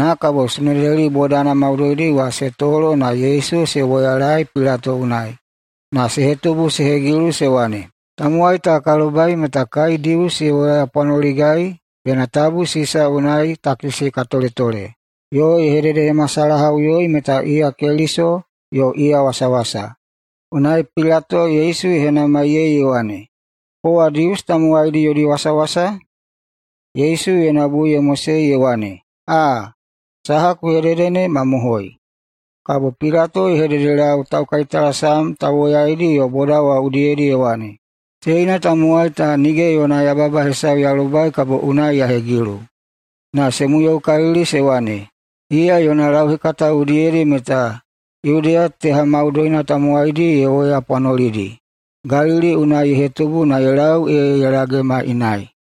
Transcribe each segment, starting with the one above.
Kabo Sunedeli bodana maudoidi wa se tolo na Yesu se woyalaei Pilato unai na se hetubu se hegilu, se wane, “Tamowai ta ka lobai meta kai Dius ye woyapwanoligai bena tabu Sisa unai takisi ka toletole yo ye hededehemasalahaꞌuyoi meta iya Keliso yo iya wasawasa.” Unai Pilato Yesu ye henamaiyei ye wane, “Kowa Dius tamowaidi yodi wasawasa?” Yesu yona bui ye mosei ye wane, “Aa, saha ku hedede ne mamohoi.” Kabo Pilato ye hededelau taukaitalasam tauwoyaidi yo boda wa udiyedi ye wane, “Teina tamowai ta nige yona yababa hesau ya lobai kabo unai ya hegilu.” Na se muyoukalili se wane, “Iya yona lauhekata udiyedi meta Yudeya teha maudoina tamowaidi ye woyapwanolidi. Galili unai ye hetubu na ye lau ee ye lagema inai.”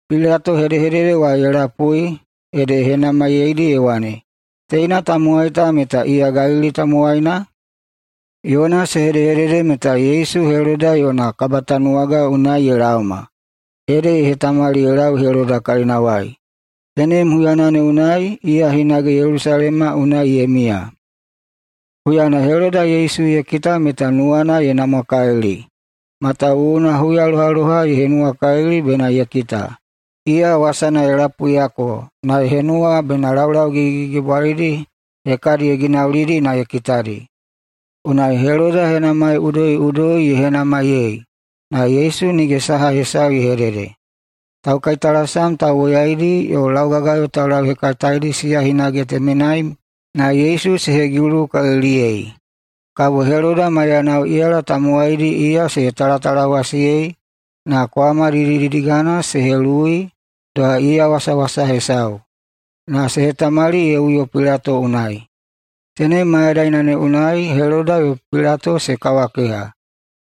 Pilato hedehedede wa ye lapui, ede ye henamaiyeidi ye wane, “Teina tamowai ta meta iya Galili tamowaina?” Yona se hedehedede meta Yesu Heloda yona kabatanuwaga unai ye laoma, ede ye hetamali ye lau Heloda kalinawai. Tenem huyana ne unai iya hinage Yelusalema unai ye miya. Huyana Heloda Yesu ye kita meta nuwana ye namwakalili, matawuwuna huyalohaloha ye henuwakalili bena ye kita. Iya wasana ye lapuiyako na ye henuwa bena laulau gigigigibwalidi hekadi ye ginaulidi na ye kitadi. Unai Heloda henamai udoiꞌudoi ye henamaiyei, na Yesu nige saha hesau ye hedede. Taukaitalasam tauwoyaidi yo laugagayo taulauhekataedi siya hinage temenai na Yesu se hegilukaliliyei. Kabo Heloda maiyanao iyala tamowaidi iya se talatalawasiyei na kwama didididigana se heluwui doha iya wasawasa hesau, na se hetamali ye uyo Pilato unai. Tenem mayadaina ne unai Heloda yo Pilato se kawakeha,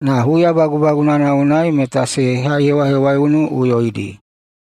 na huya bagubagunana unai meta se haihewahewaiunuꞌuyoidi.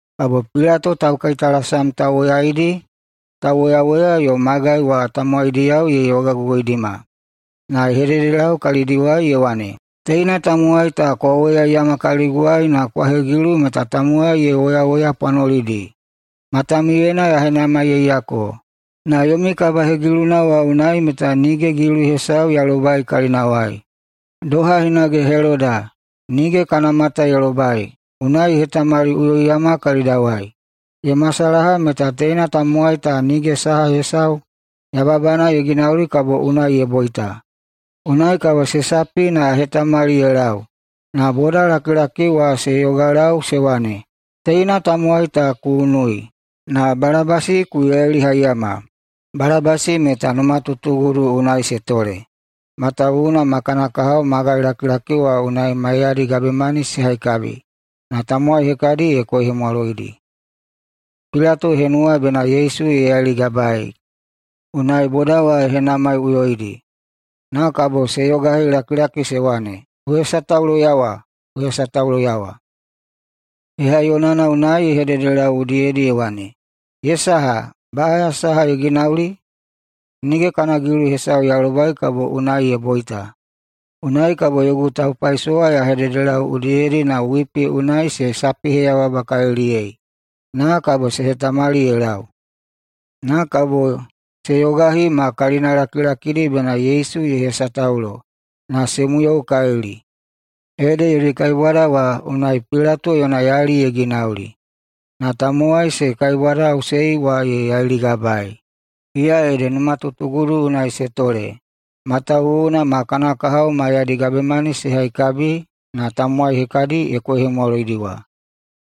Kabo Pilato taukaitalasam tauwoyaidi, tauwoyawoya yo magai wa tamowaidiyao ye yogagogoidima, na ye hededelau kalidiwai ye wane, “Teina tamowai ta kwa woyaiyama kaliguwai na kwa hegilu meta tamowai ye woyawoyapwanolidi. Matamiuyena ya henamaiyeiyako, na yomi kabahegiluna wa unai meta nige gilu hesau ya lobai kalinawai. Doha hinage Heloda nige kana mata ye lobai, unai ye hetamaliꞌuyoiyama kalidawai. Ye masalaha meta teina tamowai ta nige saha hesau yababana ye ginauli kabo unai ye boita. Unai kabo se sapi na ya hetamali ye lau.” Na bodalakilaki wa se yogalau se wane, “Teina tamowai ta ku unui! Na Balabasi ku yailihaiyama!” Balabasi meta numatutugudu unai se tole, matawuwuna ma kana kahao magailakilaki wa unai maiyadi gabemani se haikabi, na tamowai hekadi ye koihemwaloidi. Pilato ye henuwa bena Yesu ye yailigabaei, unai boda wa ye henamaiꞌuyoidi. Na kabo se yogahilakilaki se wane, “Ku hesatauloyawa! Ku hesatauloyawa!” Hehaiyonana unai ye hededelau udiyedi ye wane, “Ye saha? Baꞌaya saha ye ginauli? Nige kana gilu hesau ya lobai kabo unai ye boita. Unai kabo yogu taupaisowa ya hededelau udiyedi na wipi unai se sapiheyababakaliliyei, na kabo se hetamali ye lau.” Na kabo se yogahi ma kalinalakilakidi bena Yesu ye hesataulo, na se muyoukalili. Ede yodi kaibwada wa unai Pilato yona yali ye ginauli na tamowai se kaibwadaꞌusei wa ye yailigabaei. Iya ede numatutugudu unai se tole matawuwuna ma kana kahao maiyadi gabemani se haikabi na tamowai hekadi ye koihemwaloidi wa.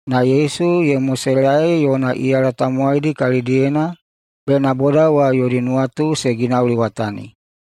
Na Yesu ye moselaei yona iyala tamowaidi kalidiyena bena boda wa yodi nuwatu se ginauliwatani.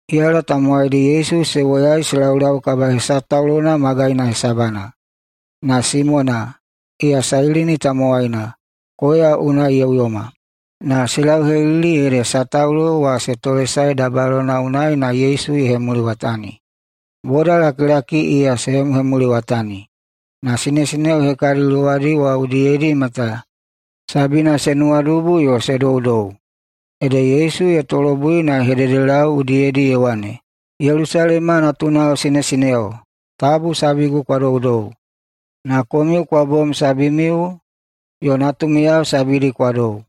Iyala tamowaidi Yesu se woyai se laulau kabahesataulona magaina hesabana, na Simona, iya Sailini tamowaina, koya unai ye uyoma, na se lauhelili ede sataulo wa se tolesae dabayalona unai na Yesu ye hemuliwatani. Bodalakilaki iya se hemuhemuliwatani, na sinesineo hekadi luwadi wa udiyedi meta sabina se nuwadubu yo se doudou. Ede Yesu ye tolobui na ye hededelau udiyedi ye wane, “Yelusalema natunao sinesineo, tabu sabigu kwa doudou, na komiu kwa bom sabimiu yo natumiyao sabidi kwa dou.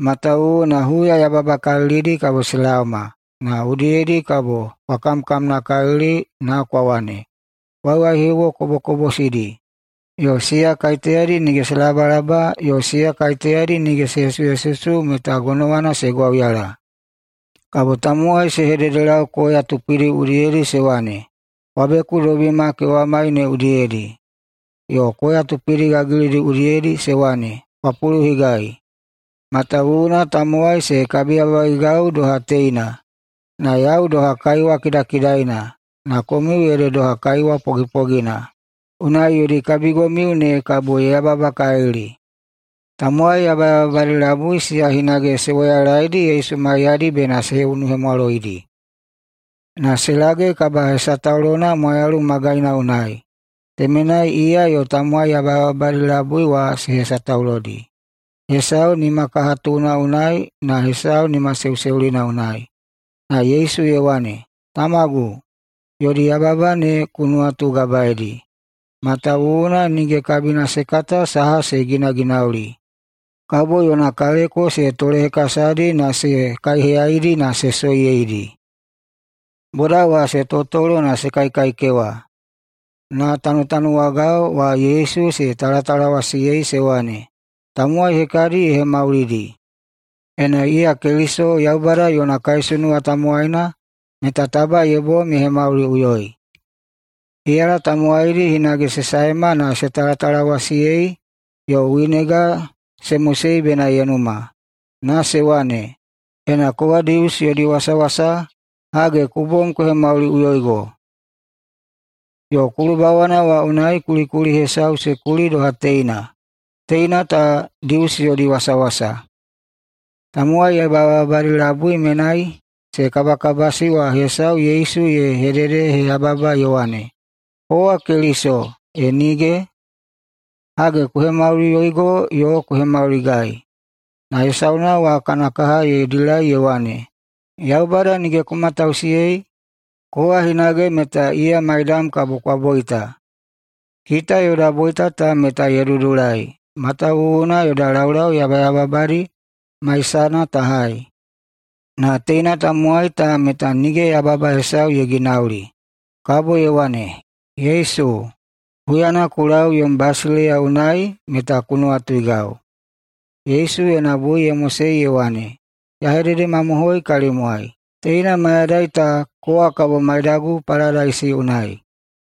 Matawuwuna huya [yababakalilidi] kabo se laoma, na udiyedi kabo [kwa kamkamnakalili] na kwa wane, ‘Waiwaihiuwo kobokobosidi, yo siya kaiteyadi nige se labalaba, yo siya nige se hesuhesusu, meta gonowana se gwauyala.’ Kabo tamowai se hededelau koya tupidi udiyedi se wane, ‘Kwa bekudobima kewamai ne udiyedi.’ Yo koya tupidi gagilidi udiyedi se wane, ‘Kwa puluhigai.’ Matawuwuna tamowai se kabiyababaigau doha teina, na yau doha kaiwa kidakidaina. Na komiu ede doha kaiwa pogipogina. Unai yodi kabigomiu ne kabo ye yababakalili.” Tamowai yabayababadi labui siya hinage se woyalaedi Yesu maiyadi bena se unuhemwaloidi. Na se lage kabahesataulona Mwayalu Magaina unai. Temenai iya yo tamowai yabayababadi labui wa se hesataulodi, hesau nimakahatuna unai yo hesau nimaseuseulina unai. Na Yesu ye wane, “Tamagu, yodi yababa ne ku nuwatugabaeidi, matawuwuna nige kabina se kata saha se ginaginauli.” Kabo yona kaleko se tolehekasadi na se kaiheyaidi na se soiyeidi. Boda wa se totolo na se kaikaikewa, na tanutanuwagao wa Yesu se talatalawasiyei se wane, “Tamowai hekadi ye hemaulidi. Ena iya Keliso, Yaubada yona kaisunuwa tamowaina, meta taba ye bom ye hemauliꞌuyoi!” Iyala tamowaidi hinage se saema na se talatalawasiyei. Yo winega se mosei bena ye numa na se wane, “Ena kowa Dius yodi wasawasa, hage, ku bom ku hemauliꞌuyoigo.” Yo kulubawana wa unai kulikuli hesau se kuli doha teina: “TEINA TA DIUS YODI WASAWASA.” Tamowai yabayababadi labui menai se kabakabasi wa hesau Yesu ye hededeheyababa ye wane, “Kowa Keliso, e nige? Hage, ku hemauliꞌuyoigo yo ku hemauligai!” Na hesauna wa kana kaha ye dilai ye wane, “Yaubada nige ku matausiyei? Kowa hinage meta iya maidam kabo kwa boita. Kita yoda boita ta meta ye dudulai, matawuwuna yoda laulau yabayababadi maisana ta hai. Na teina tamowai ta meta nige yababa hesau ye ginauli.” Kabo ye wane, “Yesu, huyana ku lau yom basileiya unai meta ku nuwatuigau.” Yesu yona bui ye mosei ye wane, “Ya hededemamohoi kalimwai: Teina mayadai ta kowa kabo maidagu paladaisi unai.”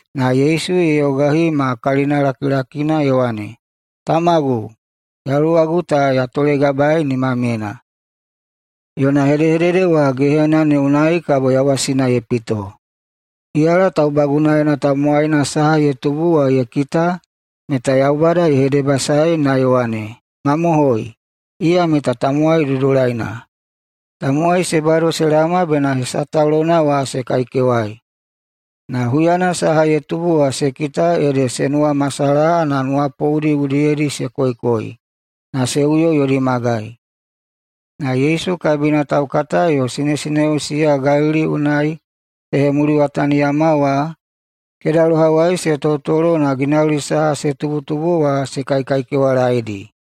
Na Yesu ye yogahi ma kalinalakilakina, ye wane, “Tamagu, yaluwagu ta ya tolegabaei nimamyena.” Yona hedehedede wa gehena ne unai kabo yawasina ye pito. Iyala taubagunaena tamowaina saha ye tubu wa ye kita meta Yaubada ye hedebasaei na ye wane, “Mamohoi, iya meta tamowai dudulaina.” Tamowai se bado se laoma bena hesataulona wa se kaikewai. Na huyana saha ye tubu wa se kita, ede [se nuwamasalaha na] nuwapoudi udiyedi se koikoi na se uyo yodi magai. Na Yesu kabina taukata yo sinesineo siya Galili unai se hemuliwataniyama wa, kedalohawai se totolo na ginauli saha se tubutubu wa se kaikaikewalaedi.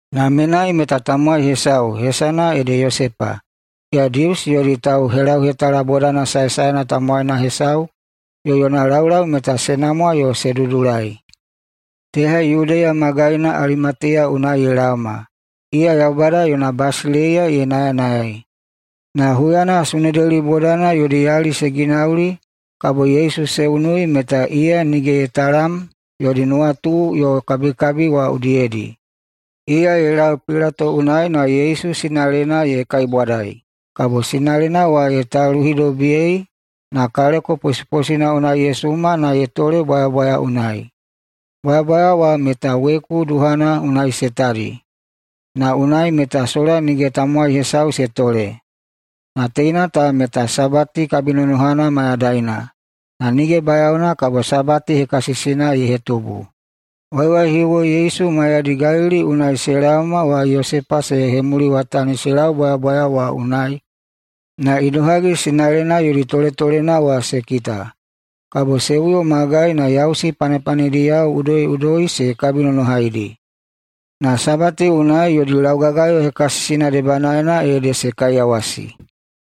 Na menai meta tamowai hesau, hesana ede Yosepa, iya Dius yodi tauhelauhetala bodana saesaena tamowaina hesau yo yona laulau meta se namwa yo se dudulai. Teha Yudeya magaina Alimatiya unai ye laoma. Iya Yaubada yona basileiya ye nayanayai. Na huyana Sunedeli bodana yodi yali se ginauli kabo Yesu se unui, meta iya nige ye talam yodi nuwatu yo kabikabi wa udiyedi. Iya ye lau Pilato unai na Yesu sinalena ye kaibwadai. Kabo sinalena wa ye taluhidobiyei, na kaleko posiposina unai ye suma na ye tole bwayabwaya unai. Bwayabwaya wa meta weku duhana na se tadi, na unai meta sola nige tamowai hesau se tole. Na teina ta meta Sabati kabinonohana mayadaina, na nige bayaona kabo Sabati hekasisina ye hetubu. Waiwaihiuwo Yesu maiyadi Galili unai se laoma wa Yosepa se hemuliwatani se lau bwayabwaya wa unai na idohagi sinalena yodi toletolena wa se kita. Kabo se uyo magai na yausi panepanediyao udoiꞌudoi se kabinonohaidi. Na Sabati unai yodi laugagayo hekasisina debanaena ede se kaiyawasi.